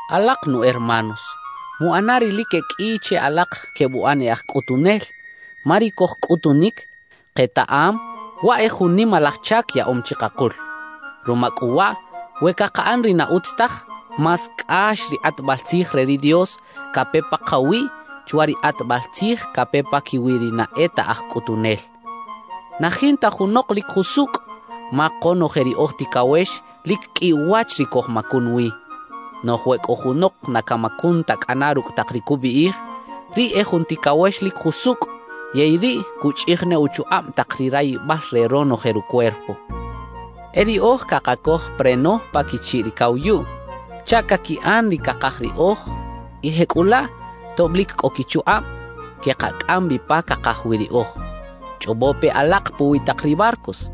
Alak nu hermanos, muꞌana ri lic e qꞌui che alak quebuꞌan e aj cꞌutunel, ma ri cojcꞌutunic, ketaꞌam waꞌ e jun nimalaj chac yaꞌom chikakul. Ruma cꞌu waꞌ, we cakaꞌan ri na utz taj, más cꞌax ri kꞌatbal tzij re ri Dios cape pakawiꞌ chwa ri kꞌatbal tzij cape paquiwi ri na e ta aj cꞌutunel. Na jinta junok lic jusucꞌ, ma konoje ri oj ticawex lic qꞌui uwach ri cojmacun wi. Noꞌj we cꞌo junok na camacun ta cꞌana rucꞌ tak ri cubiꞌij, riꞌ e jun ticawex lic jusucꞌ yey riꞌ cuchꞌij ne uchukꞌab tak ri rayibal re ronoje rucuerpo. E riꞌoj cakacoj preno pa quichiꞌ ri cawayuꞌ chaꞌ caquiꞌan ri cakaj riꞌoj y jecꞌulaꞌ tob lic cꞌo quichukꞌab, quekacꞌam bi pa cakaj wi riꞌoj. Chꞌobo pe alak puwi tak ri barcos.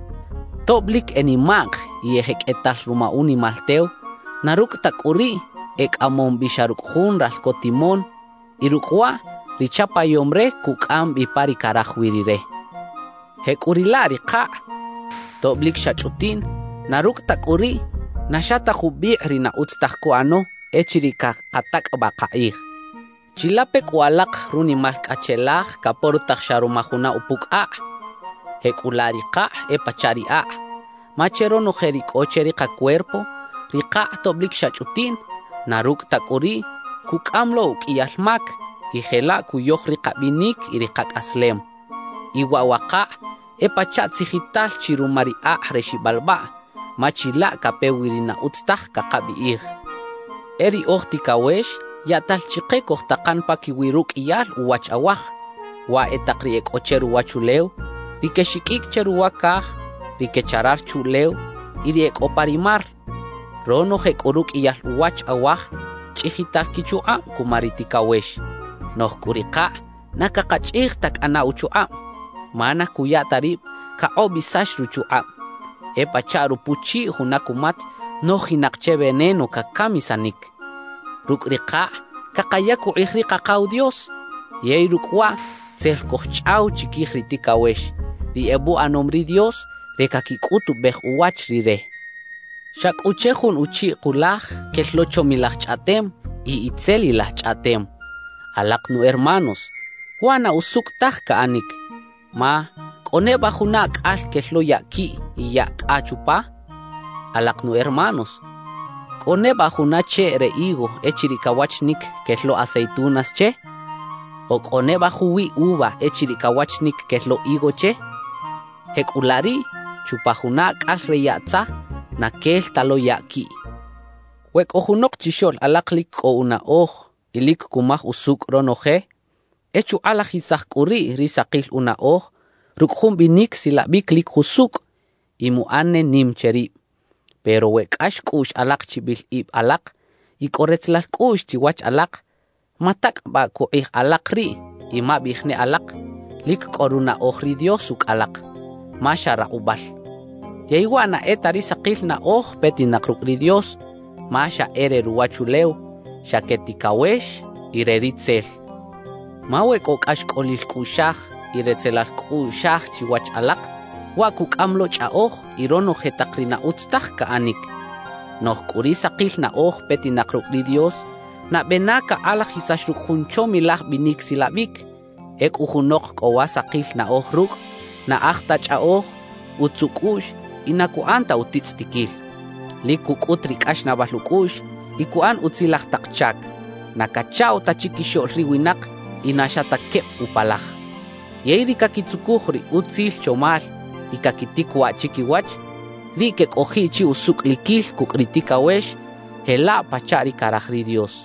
Tob lic e nimaꞌk y e jeqꞌuetal ruma unimal tew, na rucꞌ ta cꞌu riꞌ, e cꞌamom bi xa rucꞌ jun ralco timón; y rucꞌ waꞌ, ri chapayom re cucꞌam bi pa ri caraj wi rire. Jecꞌuriꞌlaꞌ ri kakꞌ, tob lic xa chꞌutiꞌn, na rucꞌ ta cꞌu riꞌ, na xa ta jubikꞌ ri na utz taj cuꞌano echiriꞌ cakatacꞌabaꞌ kakꞌij. ¡Chilape cꞌu alak runimal cꞌacheꞌlaj caporotaj xa ruma juna upucꞌ akꞌ! Jecꞌulaꞌ ri kakꞌ e pachaꞌ ri akꞌ. Ma che ronoje ri cꞌo che ri kacuerpo, ri kakꞌ tob lic xa chꞌutiꞌn, na rucꞌ ta cꞌu riꞌ, cucꞌam lo uqꞌuiyal mac y jelaꞌ cuyoj ri kabinic y ri kacꞌaslem. Y waꞌ wa kakꞌ e pachaꞌ tzijital chi ruma ri akꞌ re xibalbaꞌ, ma chilaꞌ cape wi ri na utz taj cakabiꞌij. E ri oj ticawex yaꞌtal chike cojtakan paquiwi ruqꞌuiyal uwach awaj, waꞌ e tak ri e cꞌo che ruwachulew, ri quexiqꞌuicꞌ che ruwa caj, ri quecharar chuꞌlew y ri e cꞌo pa ri mar. Ronoje cꞌu ruqꞌuiyal uwach awaj chꞌijital quichukꞌab cuma ri ticawex. Noꞌj cꞌu ri kakꞌ na cakachꞌij ta cꞌana uchukꞌab, ma na cuya ta rib cakꞌobisax ruchukꞌab; e pachaꞌ rupuchiꞌ juna cumatz nojinak che veneno cacamisanic. Rucꞌ ri kakꞌ cakayac ukꞌij ri Kakaw Dios yey rucꞌ waꞌ tzel cojchꞌaw chiquij ri ticawex, ri ebuꞌanom ri Dios re caquicꞌutubej uwach Rire. Xa cꞌu che jun uchiꞌ kulaj quel lo chomilaj chꞌaꞌtem y itzelilaj chꞌaꞌtem. Alak nu hermanos, waꞌ na usucꞌ taj caꞌanic. Ma ¿cꞌo neba juna acꞌal quel lo yaꞌ quiꞌ y yaꞌ cꞌa chupa? Alak nu hermanos, ¿cꞌo neba juna cheꞌ re higo echiriꞌ cawachinic quel lo aceitunas che? ¿O cꞌo neba juwiꞌ uva echiriꞌ cawachinic quel lo higo che? Jecꞌulaꞌ riꞌ, chupa juna acꞌal re yaꞌ tza, na quel ta lo yaꞌ quiꞌ. We cꞌo junok chixoꞌl alak lic cꞌo unaꞌoj y lic cumaj usucꞌ ronoje, e chukꞌalajisaj cꞌu riꞌ ri sakil unaꞌoj rucꞌ jun binic silabic lic jusucꞌ y muꞌan ne nim che rib. Pero we cꞌax cꞌuꞌx alak chibil ib alak y cꞌo retzelal cꞌuꞌx chiwach alak, matacꞌabaꞌ cꞌu kꞌij alak riꞌ y mabiꞌij ne alak lic cꞌo runaꞌoj ri Dios ucꞌ alak, ma xa rakꞌubal. Yey waꞌ na e ta ri sakil naꞌoj petinak rucꞌ ri Dios, ma xa e re ruwachulew, xa que ticawex y re Ritzel. Ma we cꞌo cꞌaxcꞌolil cꞌuꞌxaj y retzelal cꞌuꞌxaj chiwach alak, waꞌ cucꞌam lo chꞌaꞌoj y ronoje tak ri na utz taj caꞌanic. Noꞌj cꞌu ri sakil naꞌoj petinak rucꞌ ri Dios, nabe na cakꞌalajisax rucꞌ jun chomilaj binic silabic; ecꞌu junok cꞌo wa sakil naꞌoj rucꞌ, na aj ta chꞌaꞌoj, utz ucꞌuꞌx y na cuꞌan ta utitzꞌitiquil; lic cucꞌut ri cꞌaxnaꞌbal ucꞌuꞌx y cuꞌan utzilaj tak chac; na cachaꞌw ta chiquixoꞌl ri winak y na xa ta queb upalaj. Yey ri caquitzucuj ri utzil chomal y caquitic waꞌ chiquiwach, riꞌ quecꞌojiꞌ chi usucꞌliquil cucꞌ ri ticawex jelaꞌ pachaꞌ ri caraj ri Dios.